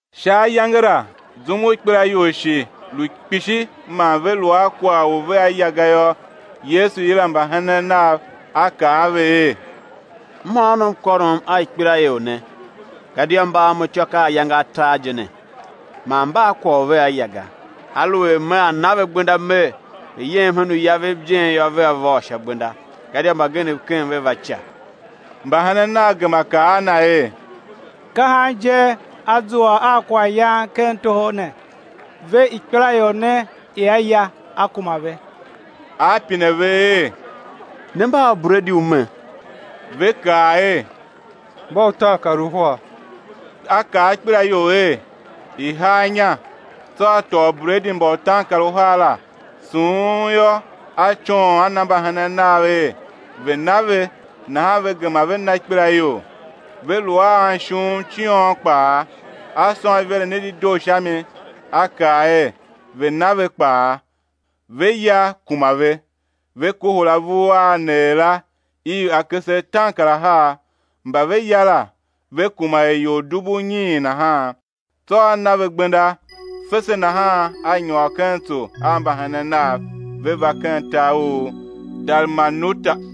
Sha ayange la zum u ikpelaior shi lu kpishi man ve lu a kwagh u vea ya ga yô, Yesu yila mbahenen Na, A kaa a ve er: Mhôônom kôrom a ikpelaior ne, gadia mba a Mo ityô ka ayange atar je ne, man mba a kwagh u vea ya ga. Aluer Mea na ve gbenda Mer, ve̱ yem hen uya vev ijen yô, vea vôr sha gbenda, gadia mbagenev ken a ve va ica. Mbahenen Nav gema kaa a Na er: Ka han je á zua a kwaghyan ken toho ne ve ikpelaior ne ia ya, á kuma ve? A pine ve er: Ne mba a ubredi u me? Ve kaa er: Mba utaankaruhar. A kaa ikpelaior er, i̱ haa inya; tsô A tôô ubredi mba utaankaruhar la, sughun yô, A coon, A na mbahenen Nav er, ve̱ na ve; nahan ve gema ve na ikpelaior. Ve lu a anishuuv ciôn kpaa. A sôn iveren i dedoo sha mi, A kaa er, ve̱ na ve kpaa. Ve ya, kuma ve; ve kohol avur a a neer la, iv akese ataankarahar. Mba ve ya la, ve kuma er ior dubu unyiin nahan. Tsô A na ve gbenda. Fese nahan A nyôr ken tso a mbahenen Nav, ve va ken tar u Dalmanuta.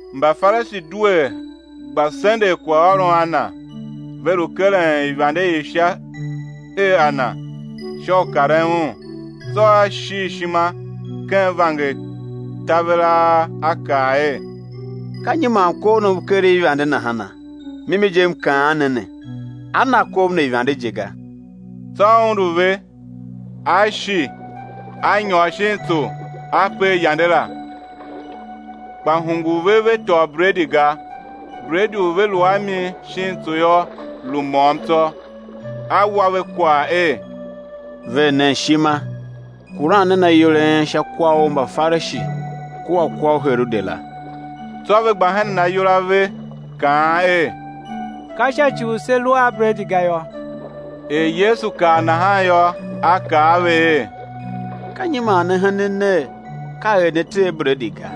Mbafarishi due gba sendegh kwaghôron a Na, ve lu keren ivande i Sha her a Na, sha u karen Un. Tsô A shil ishima ken vanger taveraa, A kaa er: Ka nyi man kov ne u keren ivande nahana? Mimi je M kaan ne ne: Á na kov ne ivande je ga. Tsô A undu ve, A shi A nyôr shin tso, A per yande la. Kpa hungul ve ve tôô bredi ga; bredi u ve lu a mi shin tso yô, lu môm tsô. A wa ve kwagh er: Ver nen ishima, kuran nen ayol a en sha kwa u Mbafarishi kua kwa u Herode la. Tsô ve gba henen ayol a ve, kaan er: Ka sha ci u se lu a bredi ga yô. Er Yesu kav nahan yô, A kaa a ve er: Ka nyi man ne henen ner, ka er ne tee bredi ga?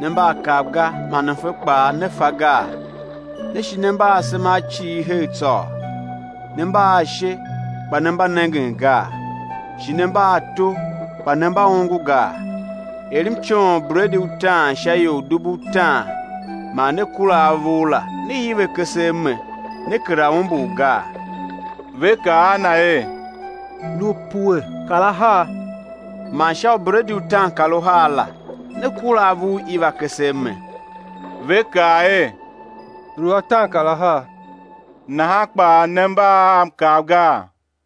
Ne mba a kav ga, man mfe kpaa ne fa gaa? Ne shi ne mba a asema a cighir her tsôô? Ne mba a ashe, kpa ne mba nengen gaa? Shi ne mba a ato, kpa ne mba ongo gaa? Er M coon ubredi utaan sha ior dubu utaan man ne kura avur la, ne iv akese a me, ne kera umbur gaa? Ve kaa a Na er: Lu pue kar ahar. Man sha ubredi utaankaruhar la ne kura avur iv akese a me? Ve kaa er: Lu ataankarahar. Nahan kpaa ne mba a kav gaa?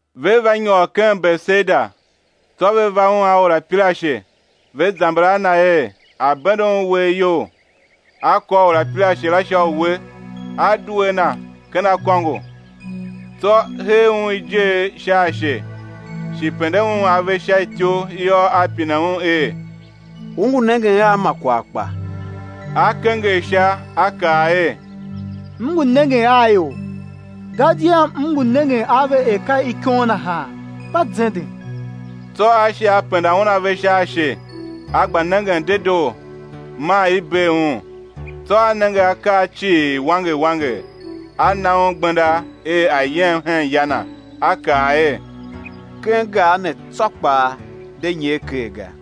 Ve va nyôr ken Betesaida. Tsô ve va Un a orapirashe, ve zamber a Na er, A̱ bende Un uwegh iyol. A kôr orapirashe la sha uwe, A due a na ken akôngo; tsô hee un ijer sha ashe, shi pende un ave sha ityou yô, A pine un er: U ngu nengen a ma kwagh kpa? A kenger sha, a kaa er: M ngu nengen a ior, gadia m ngu nengen a ve er ka ikon nahan, mba zenden. Tsô A shi penda un ave sha ashe, a gba nengen dedoo, maa i bee un; tsô a nenge akaa cii wanger wanger. A na un gbenda er a̱ yem hen ya na, A kaa er: Ken gar ne tsô kpaa, de nyer ker ga.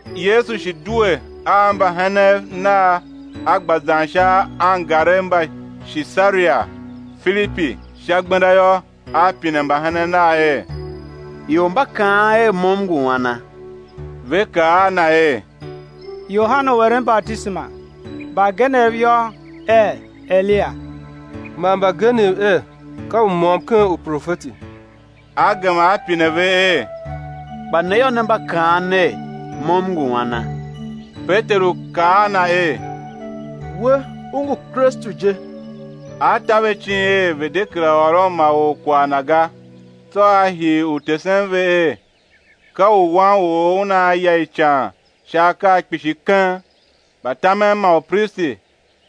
Yesu shi due a mbahenen Nav, A gba zan sha angarev mba Shisaria-Filipi. Sha gbenda yô, A pine mbahenen Nav er: Ior mba kaan er, Mo M ngu ana? Ve kaa a Na er: Yohane u eren batisema; mbagenev yô, er Eliya; man mbagenev er, ka u môm ken uprofeti. A gema A pine ver er: Kpa ne yô, ne mba kaan ner, Mo M ngu ana? Peteru kaa a Na er: We U ngu Kristu je. A ta ve icin er, ve̱ de kera ôron ma or kwagh Na ga. Tsô a hii u tesen ve er, ka u Wan u or Una ya ican sha akaa kpishi keng, mbatamen man upristi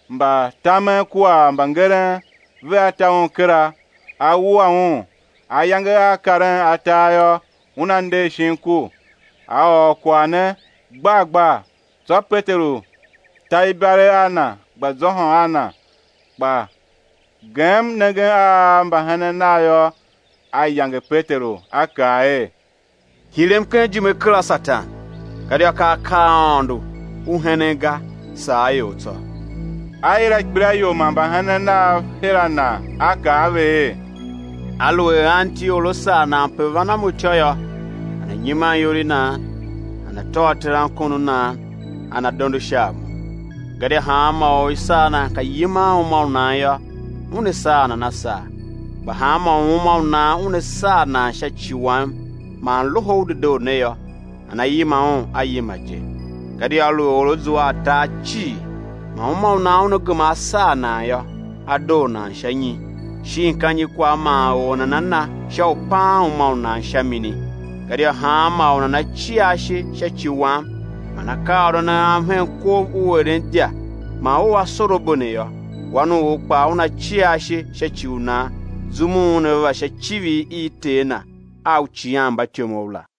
mba tamen kua mbangeren vea ta Un kera, á wua Un; ayange á karen atar yô, Una nder shin ku. A ôr kwagh ne gbar gbar. Tsô Peteru ta ibalegh a Na, gba zôhôn a Na. Kpa gem nengen a mbahenen Nav yô, A yange Peteru, A kaa er: Hirem ken ijime kera, Satan, gadia ka akaa a Aôndo u henen ga, saa a ior tsô. A yila ikpelaior man mbahenen Nav her a Na, A kaa a ve er: Aluer anti or a sar nan pe van a Mo ityô yô, nana̱ nyiman iyol i nan, nana̱ tôô terankon u nan nana̱ dondo sha a Mo. Gadia hanma or u i sar nan ka yiman uma u nan yô, una saa nan a saa; kpa hanmô u uma u nan una saa nan sha ci Wam man Loho u Dedoo ne yô, nana yima un a yima je. Gadia aluer or a zua a tar cii, man uma u nan una gema á saa nan yô, á doo nan sha nyi? Shin ka nyi kwagh man or nana na sha u paan uma u nan sha mini? Gadia hanmô u nana cia ashe sha ci Wam man akaaôron a Am hen kov u eren idya man u asorabo ne yô, Wan u or kpaa Una cia ashe sha ci u nan zum u Una va sha icivir i Ter Na a uicighanmbatyomov la.